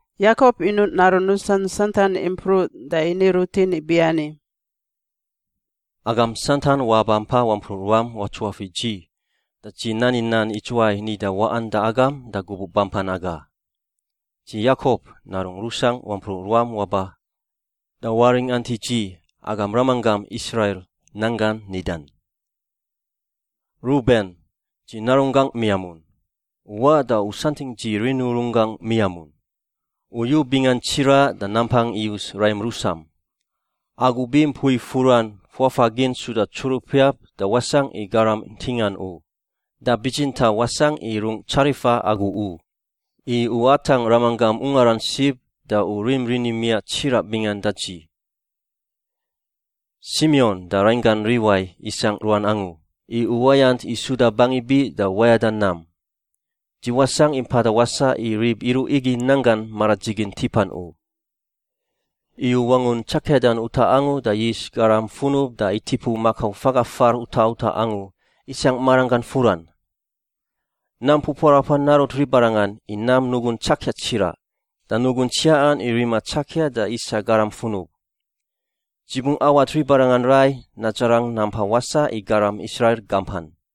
Yakop inuꞌ narun rusan santan impruꞌ da ini rutin ibiani, “Agam santan wabampa wampruꞌ ruam watsuafiꞌ dzi da dzi nani nan idzuwai nida waꞌan da agam da gubuꞌ bampan aga. “Dzi, Yakop, narungꞌ rusangꞌ, wampruꞌ ruam waba da waringant i dzi, agam ramanggam Israil, nan gangꞌ nidan. “Ruben, dzi narunggangꞌ miamun, u waꞌ da u santingꞌ dzi rini urun gangꞌ miamun. U yu bingan tsiraꞌ da nampang iyus raim rusam. Agu bi mpui furan fuafagin suda tsurupiap da wasangꞌ i garam ntingan u, da bitsintaꞌ wasangꞌ i rungꞌ tsarifa agu u, i u atangꞌ ramanggam ungaran sib da u rim rini miaꞌ tsiraꞌ bingan da dzi. “Simion da rainggan Liwai isangꞌ ruan angu i uwayant i suda bangi biꞌ da wayada nam. Dzi wasangꞌ i mpada wasaꞌ i rib iruꞌ igi nan gan maradzigin tipan u. Iyu wangun tsakiadan utaꞌ angu da yis garam funub da itipuꞌ makau faga far utaꞌ utaꞌ angu isangꞌ maranggan furan. Nam pupuarapan narut ribarangan i nam nugun tsakia tsiraꞌ da nugun tsiaꞌan i rima tsakia da isa garam funub. Dzi bungꞌ awat ribarangan rai nadzarang nampa wasaꞌ i garam Israil gampan.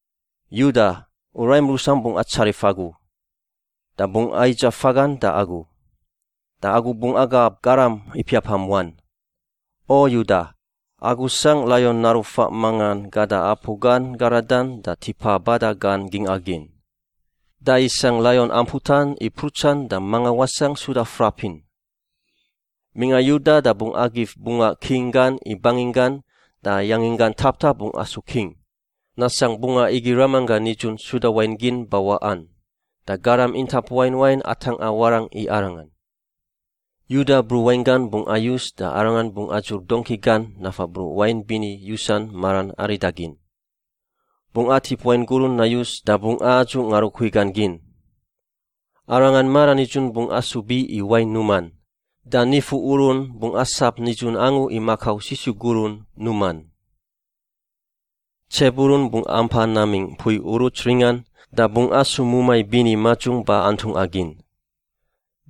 “Yuda, u raim rusam bungꞌ atsarif agu, da bungꞌ aidzaꞌ fagan da agu. Da agu bungꞌ agab garam ipiapam wan. O Yuda, agu sangꞌ laion naru faꞌ mangan gada apu gan garadan da tipa bada gan gingꞌa gin. Da isangꞌ laion amputan i mprutsan da manga wasangꞌ suda frapin. Mingꞌa Yuda da bungꞌ agif bungaꞌ king gan i banginggan da yanginggan taptap bungꞌ asu king, nasangꞌ bungaꞌ igi ramanggan nidzun suda wain gin bawaꞌan da garam intap wain wain atangꞌa warangꞌ i arangan. Yuda bruꞌ wain gan bungꞌ ayus da arangan bungꞌ adzur dongki gan nafa bruꞌ wain bini yusan maran aridagin. Bungꞌ atip wain gurun nayus da bungꞌ adzuꞌ ngarukui gan gin. Arangan maranidzun bungꞌ asu biꞌ i wain numan, da nifu urun bungꞌ asap nidzun angu i makau sisu gurun numan. “Tsebulun bungꞌ ampa namingꞌ mpui uruts ringan da bungꞌ asu mumai bini madzung ba antungꞌa gin.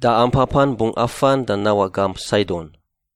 Da ampapan bungꞌ afan da nawaꞌ gamp Saidon.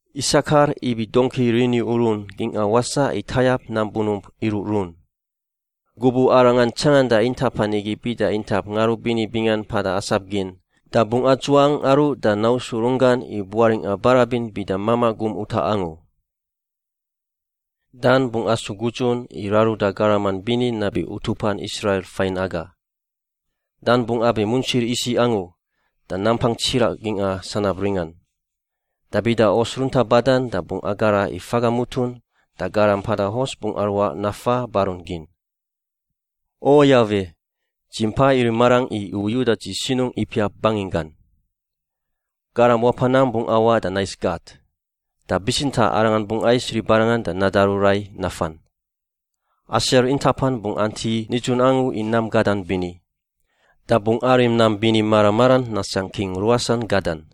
“Isakar ibi dongki riniurun gingꞌa wasaꞌ i tayap nam bunump iruꞌrun. Gubuꞌ arangan tsanganda intapan igi bida intap ngarubini bingan mpada asap gin, da bungꞌ adzuangꞌ aruꞌ da nausu runggan i buaringꞌa barabin bida mamaꞌ gum utaꞌ angu. “Dan bungꞌ asu gudzun i raruda garaman bini nabi utupan Israil fain naga. Dan bungꞌ abi muntsir isiꞌ angu da nampang tsiraꞌ gingꞌa sanab ringan. Da bida hos runta badan da bungꞌ agara i faga mutun, da garam mpada hos bungꞌ aruaꞌ nafa barun gin. “O Yawe, dzi mpa irim marangꞌ i u yuda dzi sinungꞌ ipiap banginggan. “Garam wapa nam bungꞌ awaꞌ da nais Gat, da bitsintaꞌ arangan bungꞌ ais ribarangan da nadaru rai nafan. “Aser intapan bungꞌ anti nidzun angu i nam gadan bini. Da bungꞌ arim nam bini mara maran nasangꞌ king ruasan gadan.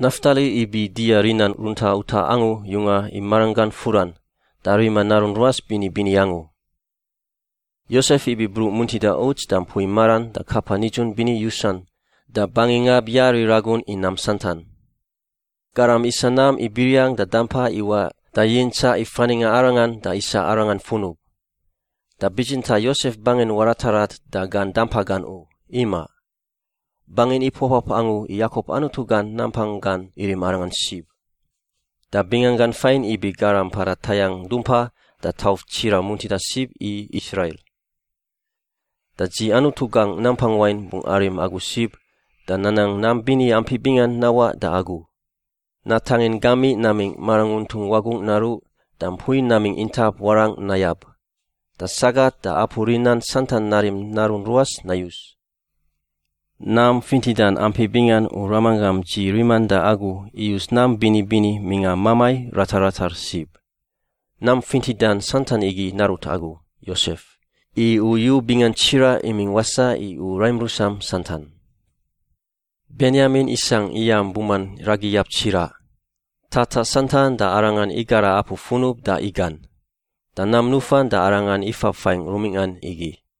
“Naftali ibi dia rinan runta utaꞌ angu yungan i maranggan furan, da rima narun ruas bini bini angu. “Yosef ibi bruꞌ muntida uts da mpui maran da kapa nidzun bini yusan da bangi ngab yari ragun i nam santan. Garam isa nam i biriang da dampa iwaꞌ da yintsaꞌ i faningꞌa arangan da isa arangan funub. Da bitsintaꞌ Yosef bangin waratarat da gan dampa gan u, imaꞌ. Bangin ipuapap angu i Yakop Anutu gan nampang gan irim arangan sib, da binganggan fain ibi Garam Mpada Tayangꞌ Dumpa da Tauf Tsiraꞌ Muntida Sib i Israil. Da dzi Anutu gangꞌ Nampang Wain bungꞌ arim agu sib da nanang nam bini ampi bingan nawaꞌ da agu: natangin gamiꞌ namingꞌ maranguntung wagungꞌ naruꞌ, da mpui namingꞌ intap warangꞌ nayab, da sagat da apu rinan santan narim narun ruas nayus. Nam fintidan ampi bingan u ramanggam dzi riman da agu iyus nam bini bini mingꞌa mamai ratar ratar sib. Nam fintidan santan igi narut agu, Yosef, i u yu bingan tsiraꞌ imingꞌ wasaꞌ i u raim rusam santan. “Benyamin isangꞌ iyam buman ragiyab tsiraꞌ. Tataꞌ santan da arangan igara apu funub da igan. Da nam nufan da arangan ifab fain rumingꞌan igi.”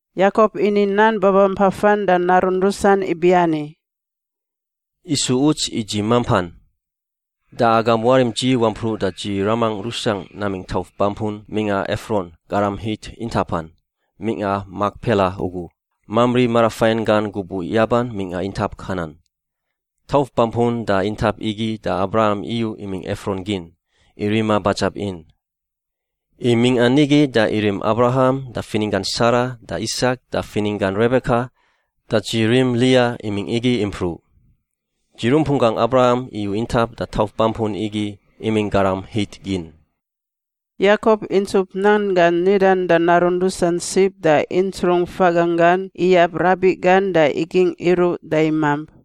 Yakop ini nan babampafan da narun rusan ibiani, “Isu uts i dzi mampan. Da agam warim dzi wampruꞌ da dzi ramangꞌ rusangꞌ namingꞌ tauf bampun mingꞌa Efron garam Hit intapan mingꞌa Makpela ugu, Mamri marafain gan gubuꞌ yaban mingꞌa intap Kanan. Tauf bampun da intap igi da Abraham iyu imingꞌ Efron gin, i rima badzab in. I mingꞌa nigi da irim Abraham da fininggan Sara da Isak da fininggan Rebeka, da dzi rim Lia imingꞌ nigi impruꞌ. Dzi rumpunggan Abraham iyu intap da tauf bampun igi imingꞌ garam Hit gin.” Yakop intsup nan gan nidan da narun rusan sib da intsrung faganggan iyab rabiꞌ gan da igingꞌ iruꞌ da imamp.